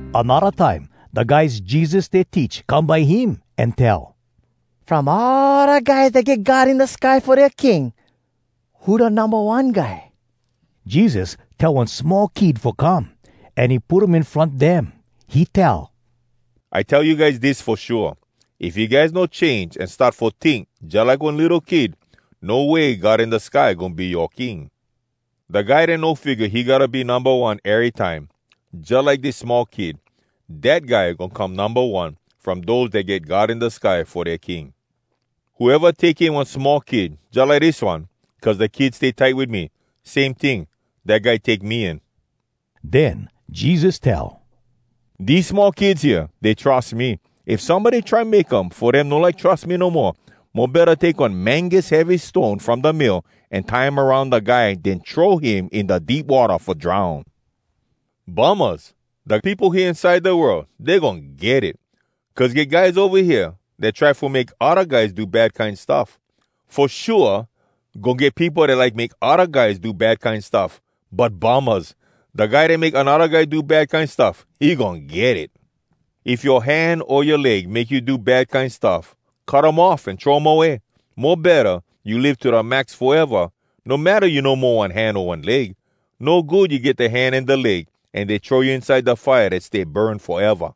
Anodda time da guys Jesus stay teach come by him, an tell, “From all da guys dat get God in da sky fo dea King, who da numba one guy?” Jesus tell one small kid fo come, an he put um in front dem. He tell, “I tell you guys dis fo shua: If you guys no change an start fo tink jalike one litto kid, no way God in da sky goin be yoa King. Da guy dat no figga he gotta be numba one erytime, jalike dis small kid, dat guy goin come numba one, from dose dat get God in da sky fo dea King. Whoeva take in one small kid jalike dis one, cuz da kid stay tight wit me, same ting, dat guy take me in.” Den Jesus tell, “Dese small kids hea, dey trus me! If somebody try make um fo dem no like trus me no moa, mo betta take one mangus heavy stone from da mill, an tie um aroun da guy, den throw him in da deep watta fo drown! “Bummahs! Da peopo hea inside da world, dey goin get it! Cuz get guys ova hea dat try fo make odda guys do bad kine stuff! Fo shua, goin get peopo dat like make odda guys do bad kine stuff. But Bummahs! Da guy dat make anodda guy do bad kine stuff, he goin get it! “If yoa hand o yoa leg make you do bad kine stuff, cut um off an throw um away! Mo betta you live to da max foeva, no matta you no mo one hand o one leg. No good you get da hand an da leg, an dey throw you inside da fire dat stay burn foeva.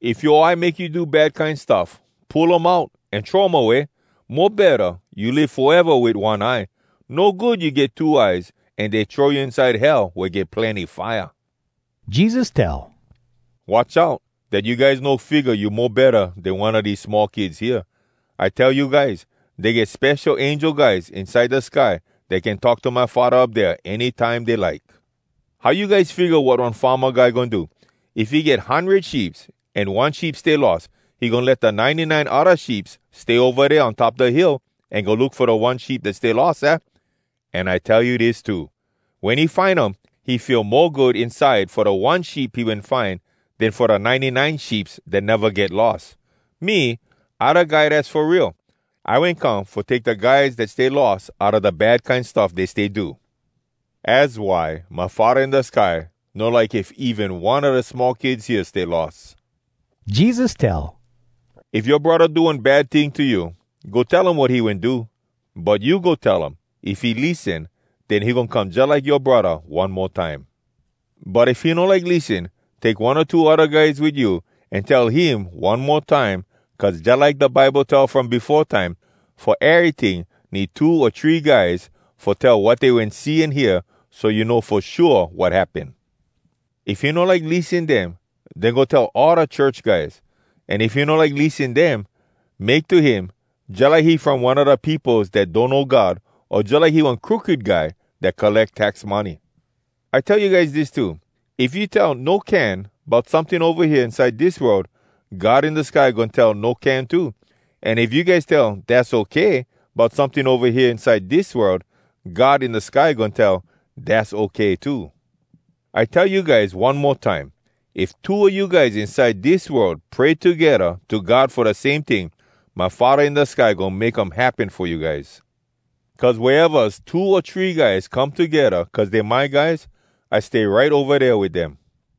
If yoa eye make you do bad kine stuff, pull um out an throw um away! Mo betta you live foeva wit one eye. No good you get two eyes an dey throw you inside Hell wea get plenny fire.” Jesus tell, “Watch out dat you guys no figga you mo betta den one a dese small kids hea. I tell you guys, dey get spesho angel guys inside da sky dat can talk to my Faddah up dea, any time dey like. “How you guys figga wat one farma guy goin do? If he get hundred sheeps, an one sheep stay lost, he goin let da ninety nine odda sheeps stay ova dea on top da hill, an go look fo da one sheep dat stay lost, aah? An I tell you dis too: wen he find um, he feel mo good inside fo da one sheep he wen find, den fo da ninety-nine sheeps dat neva get lost. [Me, I Da Guy Dass fo Real. I wen come fo take da guys dat stay lost outa da bad kine stuff dey stay do.] “Az why my Faddah in da sky no like if even one a da small kids hea stay lost.” Jesus tell, “If yoa braddah do one bad ting to you, go tell him wat he wen do. But you go tell um. If he lissen, den he goin come jalike yoa braddah one mo time. But if he no like lissen, take one o two odda guys wit you an tell him one mo time, cuz jalike da Bible tell from befo time, ‘Fo eryting, need two o three guys fo tell wat dey wen see an hear, so you know fo shua wat happen.’ If he no like lissen dem, den go tell all da church guys. An if he no like lissen dem, make to him jalike he from one a da peopos dat donno God, o jalike he one crooked guy dat colleck tax money. “I tell you guys dis too: If you tell ‘No can’ bout someting ova hea inside dis world, God in da sky goin tell ‘No can’ too. An if you guys tell ‘Dass okay’ bout someting ova hea inside dis world, God in da sky goin tell ‘Dass okay’ too. I tell you guys one mo time, if two a you guys inside dis world pray togedda to God fo da same ting, my Faddah in da sky goin make um happen fo you guys. Cuz wea evas two o three guys come togedda cuz dey my guys, I stay right ova dea wit dem.”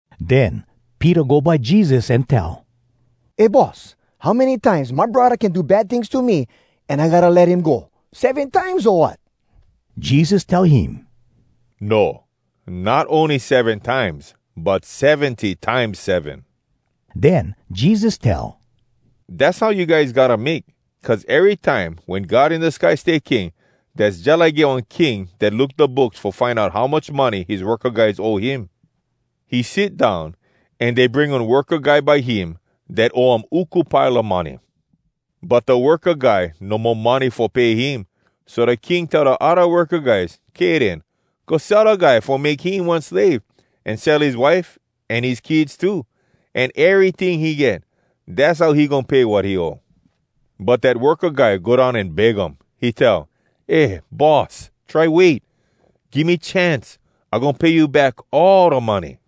Den Peter go by Jesus an tell, “Eh, Boss, how many times my braddah can do bad tings to me, an I gotta let him go? Seven times, o wat?” Jesus tell him, “No, not ony seven times, but seventy times seven.” Den Jesus tell, “Dass how you guys gotta make. Cuz erytime wen God in da sky stay King, dass jalike get one king dat look da books fo find out how much money his worka guys owe him. He sit down, an dey bring one worka guy by him dat owe um uku pile a money. But da worka guy no mo money fo pay him, so da king tell da odda worka guys, ‘Kay den. Go sell da guy fo make him one slave, an sell his wife an his kids too, an eryting he get. Dass how he goin pay wat he owe.’ “But dat worka guy go down an beg um. He tell, ‘Eh, Boss, try wait! Give me chance! I goin pay you back all da money!’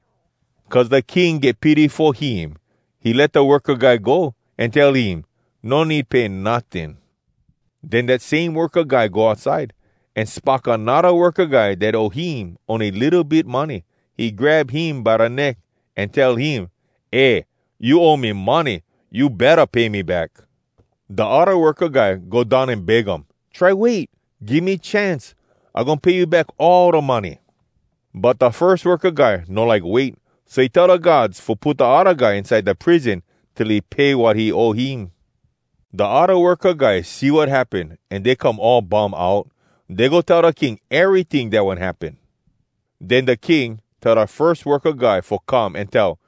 Cuz da king get pity fo him, he let da worka guy go, an tell him, ‘No need pay notting.’ “Den dat same worka guy go outside, an spock anodda worka guy dat owe him ony litto bit money. He grab him by da neck, an tell him, ‘Eh! You owe me money! You betta pay me back!’ Da odda worka guy go down an beg um, ‘Try wait! Give me chance! I goin pay you back all da money.’ “But da firs worka guy no like wait, so he tell da guards fo put da odda guy inside da prison till he pay wat he owe him. “Da odda worka guys see wat happen, an dey come all bum out. Dey go tell da king eryting dat wen happen. Den da king tell da firs worka guy fo come, an tell,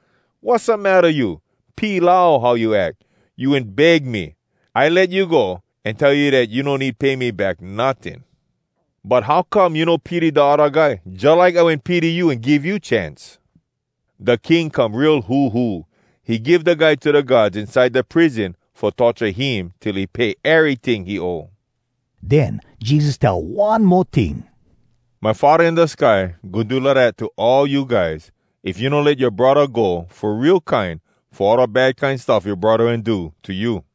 ‘Wassamatta you! Pilau, how you ack! You wen beg me. I let you go, an tell you dat you no need pay me back notting. But how come you no pity da odda guy, jalike I wen pity you an give you chance?’ Da king come real huhu. He give da guy to da guards inside da prison fo torture him, till he pay eryting he owe.” Den Jesus tell one mo ting, “My Faddah in da sky goin do lidat to all you guys, if you no let yoa braddah go fo real kine fo all da bad kine stuff yoa braddah wen do to you.”